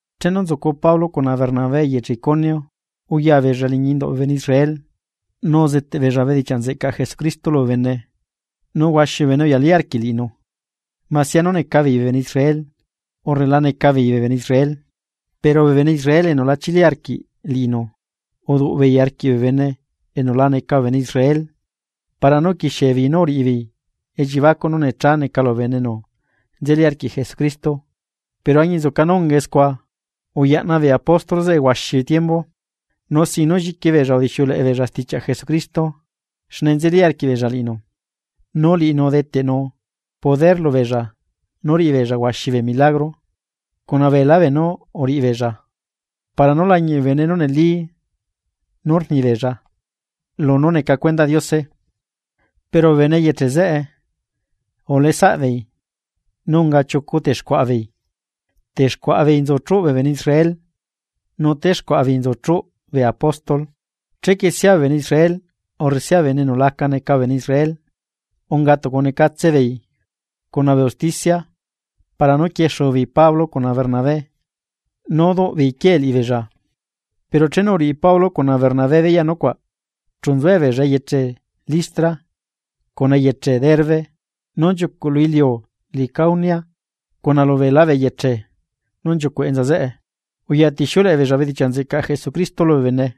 Chenu nzucu Pablo cuna Bernabé eyeche Iconio, uya beella liñi induꞌ bee bene Israel, nu uzeteꞌ beella bedichiaꞌ nzeꞌcaꞌ Jesucristo lubee bene nu huaxi bee bene uyalí arquiꞌ liꞌinu, masia nú neca beei bee bene Israel, urre la neca beei bene Israel. Pero bee bene Israel enu la chili arquiꞌ liꞌinu, uduꞌ beei arquiꞌ bee bene enu la neca bee bene Israel para nú uquixiebeei nú uriꞌibeei elliebacuꞌ nú necha neca lubee bene enu nzeli arquiꞌ Jesucristo. Pero añinzuca nú ungae scua uyaꞌna bee apóstol zeꞌe huaxi tiembu. Nu sin nú lliqui beella udixiuleꞌe beella stichiaꞌ Jesucristo xne nzeli arquiꞌbeella liꞌinu, nu liꞌinu udeteꞌnu poder lubeella nú uriꞌibeella huaxi bee milagro cuna beelá beenú uriꞌibeella para nú lañiꞌ bee bene nú neli nú rnibeella lunú neca cuendaꞌ Diose. Pero bee bene eyeche zeꞌe uleꞌe saꞌbeei nu unga chiucu texcuaꞌa beei, texcuaꞌa beei nzu chuꞌ bee bene Israel nu texcuaꞌa beei nzu chuꞌ bee apóstol. Chequie sia bee bene Israel urre sia bee bene enu la neca bee bene Israel unga tucu necatse beei cuna bee usticia para nú quiexu beei Pablo cuna Bernabé nu duꞌ beei quie liꞌibeella. Pero chenu uriꞌi Pablo cuna Bernabé beyaꞌ nucuaꞌ, chu nzuebeella eyeche Listra cuna eyeche Derbe, nú nchiucuꞌ lu iliu Licaonia, cuna lubeelá bee eyeche nú nchiucuꞌ enza zeꞌe, uyatixiuleꞌe beella bedichiaꞌ nzeꞌcaꞌ Jesucristo lubee bene.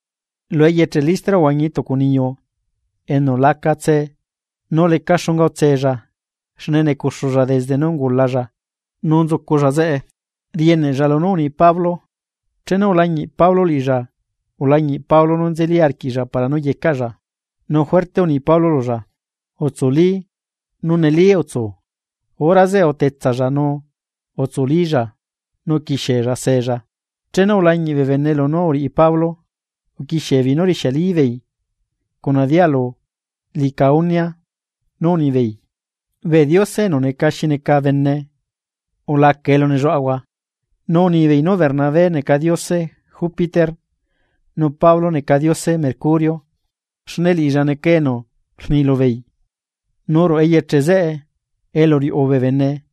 Lu eyeche Listra uhuañi tucu niyu enu laca tse nu leca xunga utsella xne necuxulla desde nú ungulalla nu nzuculla zeꞌe, rieneꞌlla lunú rni Pablo, chenu ulañiꞌ Pablo liꞌilla ulañiꞌ Pablo nú nzeli arquiꞌlla para nú yecaꞌlla. Nu juerte uni Pablo lulla: ―¡Utsuli nu neli utsu! Hora zeꞌe utetsalla nu utsulílla nu uquixie seella. Chenu ulañiꞌ bee bene lunú uriꞌi Pablo, uquixiebeei nú rixiali beei cuna dialu Licaonia nú unibeei: ―¡Bee diose enu neca xi neca bene ulaca elu nelluaꞌahua! Nu unibeei nú Bernabé neca diose Jupiter nu Pablo neca diose Mercurio, xne liꞌilla neca enu rni lubeei. Nu ruꞌu eyeche zeꞌe elu riuꞌu bee bene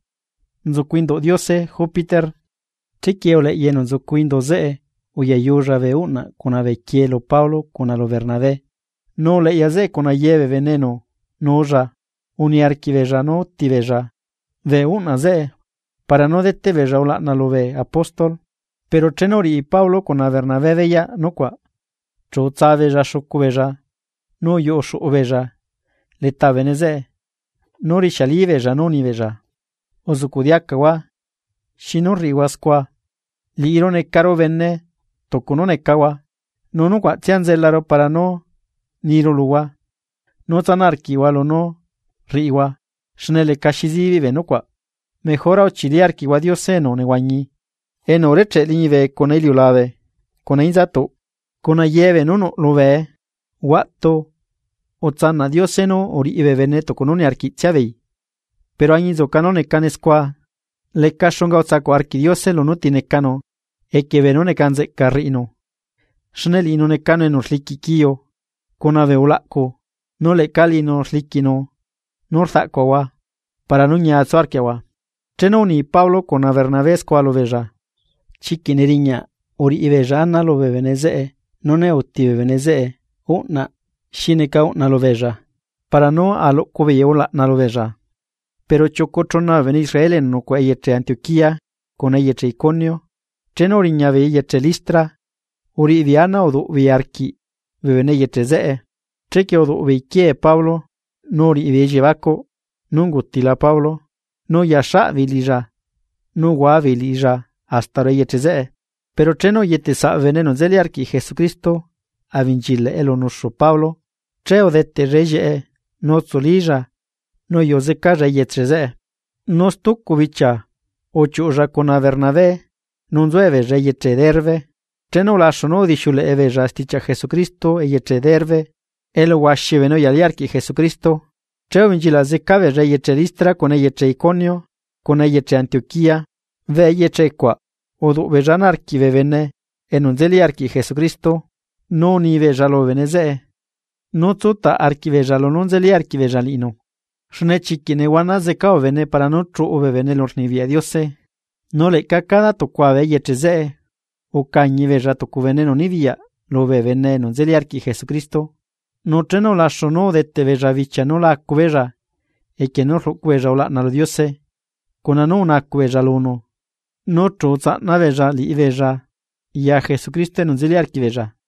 nzucu induꞌ diose Jupiter. Chequie uleꞌya enu nzucu indu zeꞌe uyayulla bee uꞌnaꞌ cuna bee quiee lu Pablo cuna lu Bernabé. Nu uleꞌya zeꞌe cuna ye bee bene enu nuulla uniarquiꞌbeella nú úti beella bee uꞌnaꞌ zeꞌe para nú deteꞌ beella ulaꞌna lubee apóstol. Pero chenu uriꞌi Pablo cuna Bernabé beyaꞌ nucuaꞌ, chu utsa beella xucu beella nu uyuꞌu xuꞌu beella leta bee bene zeꞌe nu rixiali beella nú unibeella: ―¡Uzuꞌcuꞌ diacahua! ¿Xinu rriꞌihua scua? Liꞌiru necaru bene tucu nú necahua. Nu nucuaꞌtsia nzelaru para nú niru luhua nú tsanaꞌ arquiꞌhua lunú rriꞌihua xne lecaxi zibiꞌ bee nucuaꞌ. Mejora uchili arquiꞌhua Diose enu nehuañi, enu urecheꞌ liñibe cuna iliulabe cuna inzatuꞌ cuna ye beenú nuꞌ lubee. Huaꞌtu utsanaꞌ Diose nú uriꞌi bee bene tucu nú niarquiꞌtsia beei, pero añinzuca nú necane scua, leca xunga utsacuꞌ arquiꞌ Diose lunú ti necanu equie beenú neca nzeꞌca rriꞌinu. Xne liꞌinu necanu enu rliquiꞌ quiu cuna bee ulaꞌcu nu leꞌca liꞌinu rliquiꞌnu nu rdaꞌcuaꞌahua para nú ñia tsu arquiaꞌahua. Chenu uni Pablo cuna Bernabé scua lubeella, chiquiꞌ neriñaꞌ uriꞌibeella ana lubee bene zeꞌe nú ne uti bee bene zeꞌe uꞌnaꞌ xi neca uꞌna lubeella para nú aluꞌcu beei ulaꞌna lubeella. Pero chiucu chuna bee bene Israel enu nucuaꞌa eyeche Antioquía cuna eyeche Iconio, chenu uriña beei eyeche Listra uriꞌibeei ana uduꞌ beei arquiꞌ bee bene eyeche zeꞌe. Chequie uduꞌ beei quiee Pablo nu uriꞌibeei elliebacuꞌ nú ungutila Pablo nu uya xaꞌ beei liꞌilla nu uhuabeei liꞌilla hasta ruꞌu eyeche zeꞌe. Pero chenu uyetesaꞌ bee bene enu nzeli arquiꞌ Jesucristo abenchilaꞌ elu nuxu Pablo, che udeteꞌlla ellieꞌe nu utsulílla nu uyuꞌu zecalla eyeche zeꞌe. Nu stucu bichia uchiuꞌlla cuna Bernabé nu nzuebeella eyeche Derbe. Chenu ulaxu nú udixiuleꞌe beella stichiaꞌ Jesucristo eyeche Derbe elu huaxi bee bene uyalí arquiꞌ Jesucristo, che ubenchilaꞌ zeca beella eyeche Listra cuna eyeche Iconio cuna eyeche Antioquía. Bee eyeche cuaꞌ uduꞌ beella ana arquiꞌ bee bene enu nzeli arquiꞌ Jesucristo, nu unibeella lubee bene zeꞌe nú tsutaꞌ arquiꞌbeella lunú nzeli arquiꞌbeella liꞌinu, xne chiquiꞌ nehuana zeca bee bene para nú chuꞌu bee bene elurnibiyaꞌ Diose. Nu leꞌca cada tucua bee eyeche zeꞌe ucañi beella tucu bene enu nibiyaꞌ lubee bene enu nzeli arquiꞌ Jesucristo, nu chenu ulaxu nú udeteꞌbeella bichia nú la acu beella equie nú rluꞌcu beella ulaꞌna lu Diose, cuna nú unacuꞌ beella lunu nu chu utsaꞌna beella liꞌibeella ya Jesucristo enu nzeli arquiꞌbeella.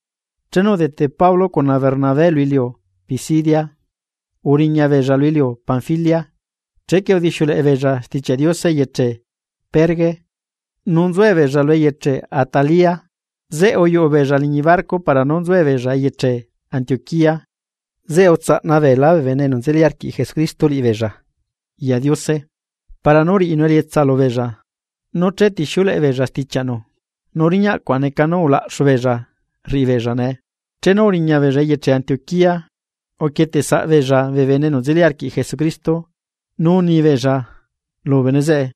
Chenu udete Pablo cuna Bernabé lu iliu Pisidia, uriña beella lu iliu Panfilia. Chequie udixiuleꞌe beella Stichiaꞌ Diose eyeche Perge. Nu nzuebeella lu eyeche Atalia. Zeꞌe uyuꞌu beella liñi barco para nú nzuebeella eyeche Antioquía zeꞌe utsaꞌna beelá bee bene enu nzeli arquiꞌ Jesucristo liꞌibeella ya Diose para nú riꞌinu elietsa lubeella nú chetixiuleꞌe beella stichiaꞌnu. Nu riñaꞌ cuaꞌ neca nú ulaꞌxu beella rriꞌibeella nee. Chenu uriñabeella eyeche Antioquía, uquieteꞌsaꞌ beella bee bene enu nzeli arquiꞌ Jesucristo nu unibeella lubee bene zeꞌe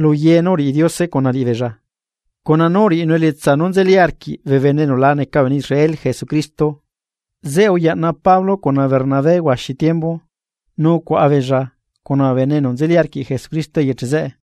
lu ye nú uriꞌi Diose cuna liꞌibeella, cuna nú uriꞌinu elietsa nú nzeli arquiꞌ bee bene enu la neca bee bene Israel Jesucristo. Zeꞌe uyaꞌna Pablo cuna Bernabé huaxi tiembu nu ucuaꞌa beella cuna bee bene enu nzeli arquiꞌ Jesucristo eyeche zeꞌe.